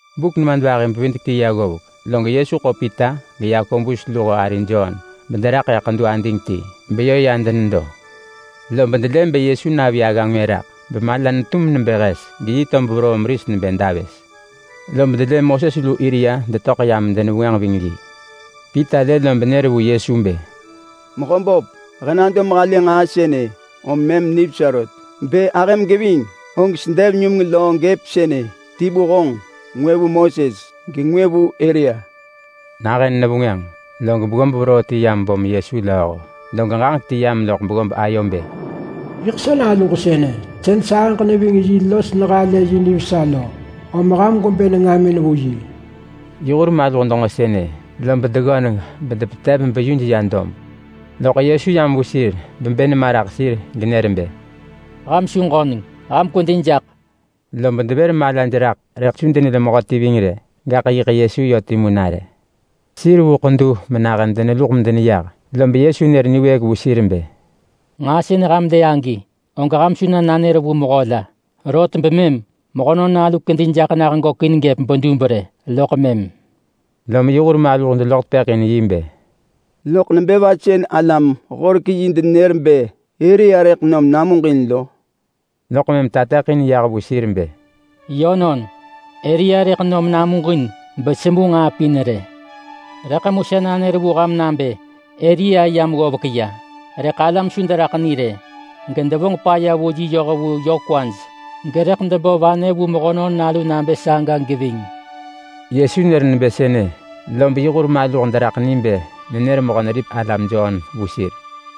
Buk nemadvahi-bevidek-ti ya ggovek, log Yesu ḳo Pita geYakobus luho ari Jon bederaḳ ḳedu ading ti, beyö ya denedo. Lob delë bë Yesu navi agga ngwë raḳ, bemala netum nebë hes, geyi tob veroo meris nebë davës. Lob delë Moses lu Elia detöḳ yam medenevengwënġ ving yi. Pita lë lob nër vu Yesu bë, “Mehöböp, he nado mehalë nġaa sënë om mëm nivesa rot. Bë ahëm geving, og sedev numeng löö gëp sënë, ti vu honġ, ngwë vu Moses, gengwë vu Elia.” Nahën nevengwënġ, log beggob veroo ti yam bom Yesu lööho, log ġaġek ti yam loḳ beggob ayo nebë, “Sa Naluġ yiḳ sënë, sën sahëġ neving yi los halë yi nivesa lo. Ham gwebë nengamin vu yi!” Yi hur maluh denġo sënë, lob deggöneng bedepetev beyuj ya dob. Loḳ Yesu yam vu sir bebë nema raḳ sir genër bë, “Ham su ġöneng rë, ham kwedi jaḳ!” Lob devër malaj raḳ rëḳ su denelë mehöti ving rë, gaḳ yiḳ Yesu yö timu nare. Sir vu ḳedu menahën deneluḳ medeneyah, lob Yesu nër niwëëk vu sir bë, “Nġaa sën ham lë agi, og ham su na nanër vu mehö la. Rot bemëm Mehönon Nalu kedi jaḳ nah gökin gëp bedub rë, loḳ mëm.” Lom yi hur maluh deloḳ tepëḳ in yi bë, “Loḳ nebë va sën alam-horek-yi denenër bë Elia rëḳ nom namuġin lo?” Loḳ mëm tateḳin yah vu sir bë, “Yönon, Elia rëḳ nom namuġin besemu nġaa pin rë. Rëḳ mu sa nanër vu ham nabë Elia yam ggovek ya, rëḳ alam su deraḳ ni rë, gedevonġ paya vu yi yoh vu yö kwaj. Gerëḳ debo vanë vu Mehönon Nalu nabë saga geving.” Yesu nër nebë sënë, lob yi hur maluh deraḳ ni bë nenër Mehö-neripek-alam Jon vu sir.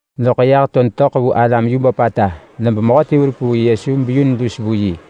Loḳ yah to detöḳ vu alam yu böpata, lob mehöti verup vu Yesu beyun lus vu yi,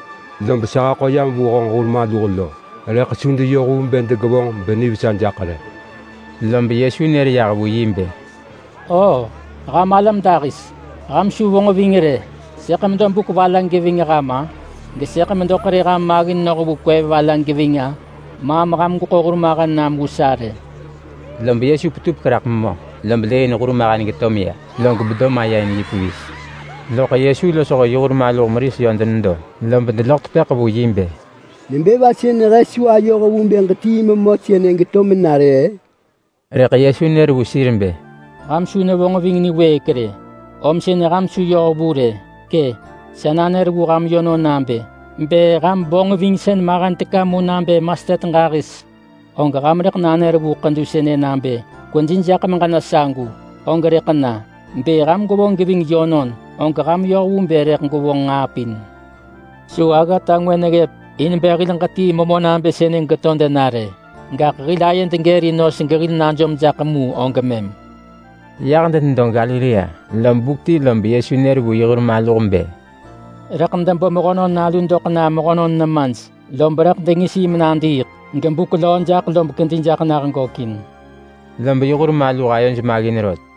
Lob sa haḳo yam vu honġ hur maluh lo rëḳ su deyoh vu bë degevonġ benivesa jaḳ rë.” Lob Yesu nër yah vu yi bë, “Oo, ham alam dahis! Ham su vonġ ving rë! Sëḳ medo buk va la geving ham-a? Gesëḳ medo ḳerë ham maggin noh vu kwev va la geving-a? Maam ham gweḳo hurmahen nam vu sa rë!” Lob Yesu petupek raḳ memö, lob lëëin hurmahen geto meya, log bado maya in yi pevis. Loḳ Yesu losho yi hur maluh meris yö denedo, lob deloḳ tepëḳ vu yi bë, “Nebë va sën he su ayoh vu bë ġetii memö sënë geto mena rë-ë?” Rëḳ Yesu nër vu sir bë, “Ham su nevonġ ving niwëëk rë, om sën ham su yoh vu rë! Kë! Sa nanër vu ham yönon nabë: Bë ham vonġvingsën mahen teka mu nabë mastet ġahis, og ham rëḳ nanër vu ḳedu sënë nabë ‘Kwedi jaḳ meġena sagu!’, og rëḳ na. Bë ham gwevonġ geving yönon, og ham yoh vu bë rëḳ gwevonġ nġaa pin. [Su aggata ngwë neggëp in bë hil ġetii memö nabë sënë geto dena rë. Gaḳ hil ayed gërin nos gehil najom jaḳ mu og mëm.]” Yah denedo Galilea lob buk ti lob Yesu nër vu yi hur maluh bë, “Rëḳ debo Mehönon Nalu doḳ na mehönon nemaj. Lob rëḳ dengis yi menadiiḳ, loḳ buk natu löö lob kedi jaḳ nah gökin.” Lob yi hur maluh ayoj maggin rot.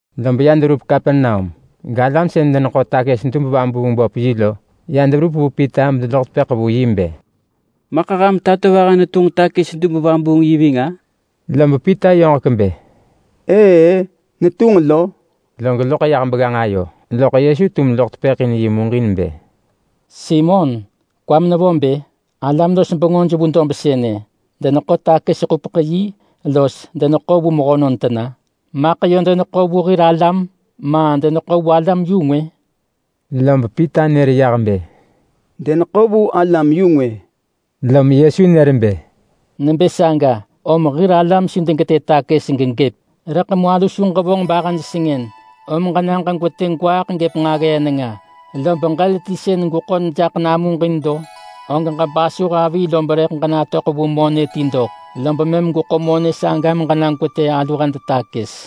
Lob ya deverup Kapernaum, galam sën deneḳo takës-dub-vabuung-böp-yi lo ya deverup vu Pita bedeloḳ tepëḳ vu yi bë, “Maḳ ham tatovaha netunġ takës-dub-vabuung-yi ving-a?” Lob Pita yoġek bë, “Ëë-ë, netunġ lo!” Log loḳ ya begganġ ayo, loḳ Yesu tum loḳ tepëḳ in yi muġin bë, “Simon! Kwam nevo bë? Alam-los-bengöj vu dob sënë, deneḳo takës-ḳupeḳ-yi los deneḳo vu mehönon tena? Maḳ yö deneḳo vu hir alam, ma deneḳo vu alam-yu-ngwë?” Lob Pita nër yah bë, “Deneḳo vu alam-yu-ngwë!” Lom Yesu nër bë, “Nebë saga, om hir alam su degetë takës gegëp! Rëḳ mu alu su ġevonġ bahëj sengën. Om ġena ġeseyu gwaaḳ gëp nġaggee nenga, lob ġël ti sën rëḳ berup namuġin begweḳo jaḳ lo, og ġebasuh avi lob rëḳ ġenatöḳ vu monë ti doḳ. Lob mëm gweḳo monë saga meġena gwetë natu alu hed takës.”